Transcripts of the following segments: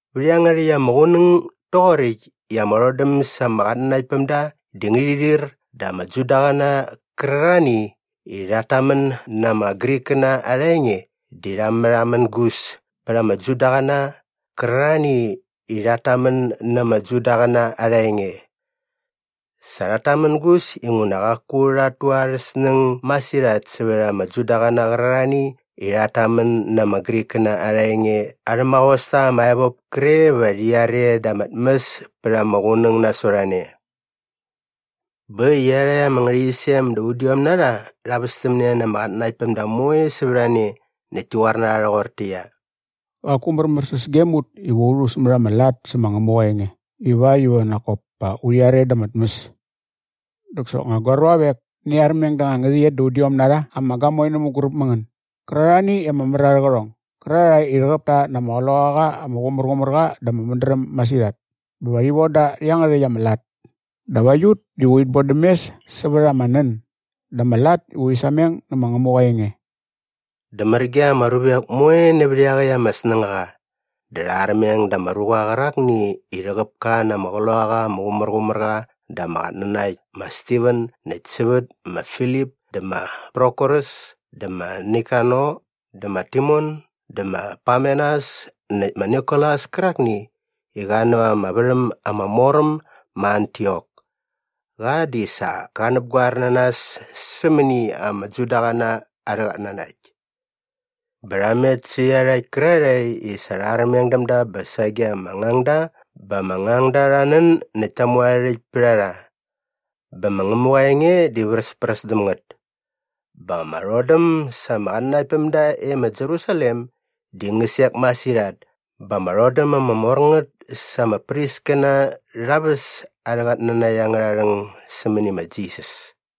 Vät iangärhäkt ama qunäng doqoräkt i ama rhodäm sa ama qatnanaktpämda di ngärhi rhir dä ama Judaqäna qärarhani i rhat tamän na ama Grikkäna arha enge di rha märhamängus pät ama Judaqäna qärarhani i rhat tamän na ama Judaqäna arha enge. Sa rhat tamängus inguna qaku rhat tu arhä snäng masirhat sävät ama Judaqäna qärarhani i rhat tamän na ama Grikkäna arha enge arhä maqosta ama evop kre va rhi are da ama tmäs pät ama qunäng nasot a ne. Bä äkt i iarhakt ama ngärhäqyisem da udiom na rha rha västämne na ama qatnanaktpämda moe sävät a ne näkt ti qoar na rha rhoqortäqyia, “Qaku märmäräs gem ut iva u rhu sämät ama lat sä ma Ngämuqa aa enge ivakt iva nak kop pa urhi are da ama tmäs. Dä soknga gua ruavek, ngäni armeng da anga ngärhäqyet da udiom na rha ama gamoe nä mänguräp mä ngän gärarhani i ama mär arhä qärhong gärarhae i rhäqäp ta na ama Qloqaqa ama Qumärqumärqa dä ama mädräm masirhat bä va urhi von da rhä iangärhäkt ama lat dap aiut diva urhit bodäm mes sävät ama nän dä ama lat i urhi sameng nä ma Ngämuqa aa enge.” Dä mär ge ama ruvek moe nävät iaqäkt ama snängaqa. Dä rha armeng da ama ruqa qärakni i rhäqäp ka na ama Qloqaqa ama Qumärqumärqa dä ama qatnanakt ma Stiven näkt sävät ma Filip dä ma Prokorus dä ma Nikanor dä ma Timon dä ma Parmenas näkt ma Nikolas kärakni i qa näva ama värhäm ama mor äm ma Antiok. Qa di sa qa näpgoer na nas sämäni ama Judaqäna arhä qatnanakt. Bä rha met sä iarhakt kärarhae i sa rha armeng däm da bä sage ama ngangda bä ama ngangda rha nän näkt ta mu arhä rhäkt pät a rha. Bä ma Ngämuqa aa enge di vräspräs däm ngät. Bä ama rhodäm sa ama qatnanaktpämda e ma Jerusalem di ngä sek masirhat bä ama rhodäm ama mor ngät sa ama priskäna rha väs arhä qatnanakt angärha rhäng sämäni ma Jisas.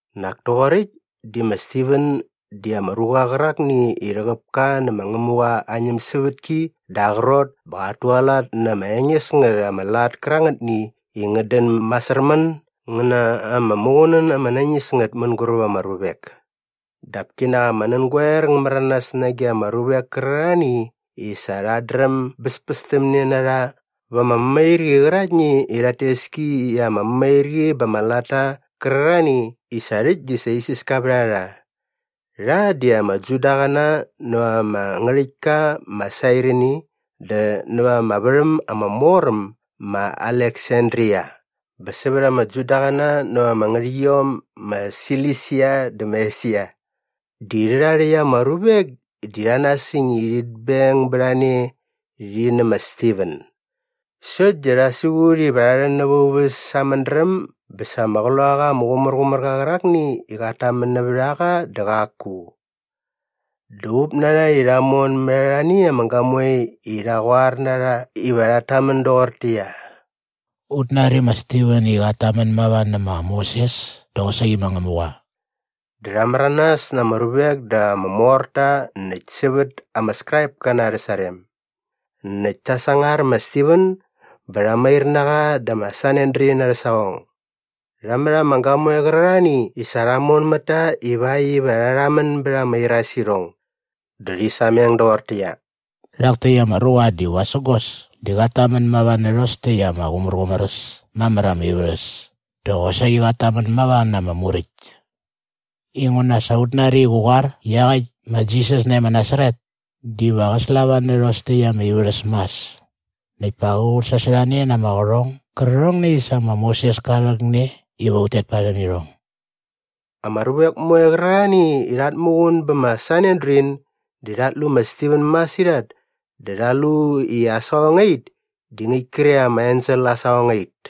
Nak toqoräkt di ma Stiven di ama ruqa qärakni i rhäqäp ka nä ma Ngämuqa aa ñämsävätki dä aa qrot bä qat tualat na ama enges ngät ama lat kärangätni i ngät dän masärmän ngä na ama muqunän ama nañis ngät mänguräp ama ruvek. Dap kinak ama nängoer ngä märanas nage ama ruvek kärarhani i sa rhat dräm bäspästämne na rha va ama mämairqi qäraktni i rhat tes ki i ama mämairqi ba ama latta qärarhani i sa rhäkt di isiska vät a rha. Rha di ama Judaqäna näva ama ngärhäktka ma Sairini dä näva ama värhäm ama mor äm ma Aleksandria bä sävät ama Judaqäna näva ama ngärhäqyiom ma Silisia dä ma Esia. Di rhärha rhäkt ama ruvek di rha nasäng i rhit beng bät a ne rhi nä ma Stiven sokt di rha siqut iva rha rhän näva aa uväs sa aa mädräm bä sa ama Qloqaqa ama Qumärqumärqa qärakni i qat tamän nävät a qa dä qaku. Dä up na rha i rha mon mät arhani ama gamoe i rha qoar na rha iva rhat tamän doqortäqyia, “Ut nari ma Stiven i qat tamän mava nä ma Moses dä qosaqi ma Ngämuqa.” Dä rha märanas na ama ruvek dä ama morta näkt sävät ama Skraipkäna arhä sarem. Näkt ta sangar ma Stiven bä rha mair na qa dä ma Sanedrin arhä saqong. Rha mät ama gamoe qärarhani i sa rha mon mät ta ivakt iva rha rhamän bät ama irasirhong. Dä rhi sameng doqortäqyia, “Rhak täkt ama ruqa di vasägos dä qat tamän mava nä rhos täkt ama qumärqumär äs mamär ama ivärhäs dä qosaqi qat tamän mava na ama Muräkt. Inguna sa ut nari i qä qoar i iaqäkt ma Jisas nae ma Nasaret diva qä slava nä rhos täkt ama ivärhäs mas näkt pa qä qutsasorhane na ama qärhong gärqärhongni i sa ma Moses ka rhäkne iva ut tet parhäm irhong.” Ama ruvek moe qärarhani i rhat muqun bä ma Sanedrin di rhat lu ma Stiven masirhat dä rha lu i aa saqongait di ngäkt kre ama ensel aa saqongait.